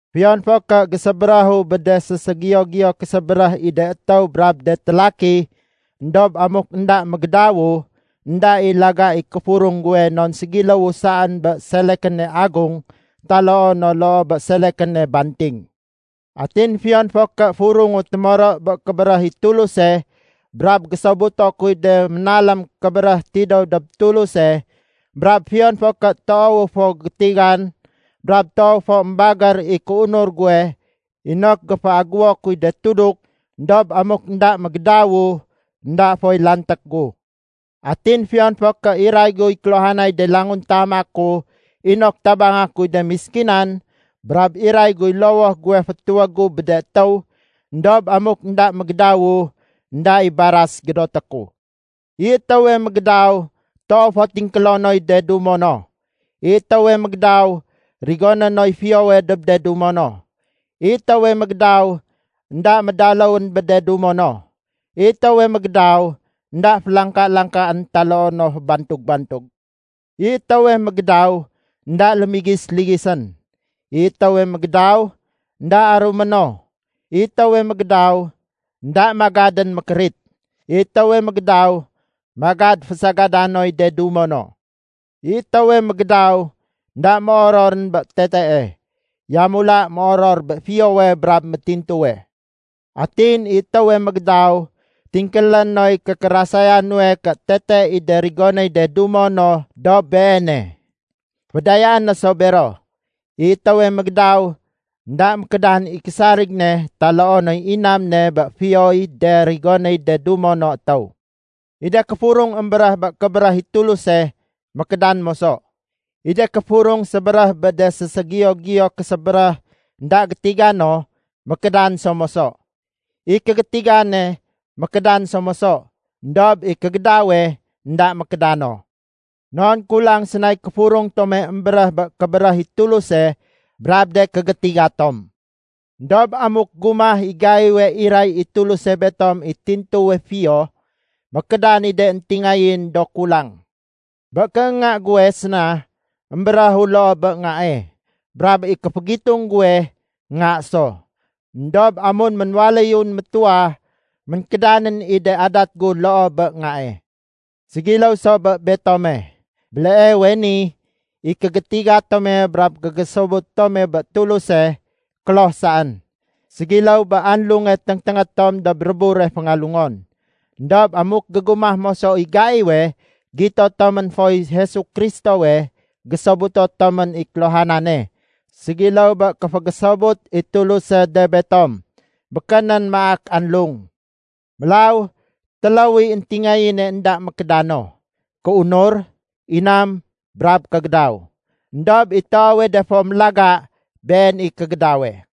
Fiyon fo ké gésébéréhu bé de séségiyo-giyo késébéréh i de étéw brab de télaki, éndob amuk énda mégédawu, énda i laga i kéfurung guwe non ségiléwu saén bé selekéne agung taloo no loo bé selekéne banting. Atin fiyon fo ké furungu témoro bé kébéréh i Tuluse, brab gésobuto kuy de ménalém kébéréh tidéw dob Tuluse, brab fiyon fo ké toowu fo gétigan, brab toow fo émbagér i kéunur guwe inok géféaguwo kuy de tuduk, éndob amuk énda mégédawu, énda foy lanték gu. Atin fiyon fo ké iray guy kéluhanay de languntama ku inok tabanga kuy de méskinan, brab iray guy lowoh guwe fétuwég gu bé de étéw, éndob amuk énda mégédawu, énda i baras gédoté ku. I étéwe mégédaw toow fo tingkélo noy de dumo no. I étéwe mégédaw rigoné noy fiyowe dob de dumo no. I étéwe mégédaw énda médaléwén bé de dumo no. I étéwe mégédaw énda félangka-langkaén taloo no fébantug-bantug. I étéwe mégédaw énda lémigis-ligisén. I étéwe mégédaw énda arumé no. I étéwe mégédaw énda magadén mékérit. I étéwe mégédaw magad fésagada noy de dumo no. I étéwe mégédaw énda méororén bé tetee. Yamula méoror bé fiyowe brab métintuwe. Atin i étéwe mégédaw tingkélé noy kékérasaya nuwe ké tete i de rigonéy de dumo no dob beene. Fédayaé no sa bero. I étéwe mégédaw, énda mékédan i késarig ne taloo noy inam ne bé fiyoy de rigonéy de dumo no étéw. I de kéfurung émbéréh bé kébéréh i Tuluse, mékédan moso. I de kéfurung sébéréh bé de séségiyo-giyo késébéréh énda gétiga no, mékédan so moso. I kégétigane, mékédan so moso. Endob i kégédawe énda mékéda no. Non kulang sénay kéfurung tome émbéréh bé kébéréh i Tuluse brab de kégétiga tom. Endob amuk gumah i gaiwe iray i Tuluse betom i tintuwe fiyo, mékédan i de éntingayén do kulang. Bé kéénga guwe séna émbéréhu loo bé ngae, brab i kéfégitung guwe, nga so. Endob amun ménwaléyun métuwa, ménkédanén i de adat gu loo bé ngae. Ségiléw so bé betome. Béleewe ni, i kégétiga tome brab kégésobut tome bé Tuluse, kloh saén. Ségiléw bé anlunge téngténgé tom dob rébure féngalungon. Endob amuk gégumah moso i gaiwe gito tomén foy Jesu Kristowe, gésobuto tomén i kéluhanane, ségiléw bé kéfégésobut i Tuluse de betom, békénén maak anlung. Mélaw téléw i éntingayéne énda mékéda no: kéunur, inam, brab kégédaw. Endob i toowe de fo imfortante, been i kégédawe.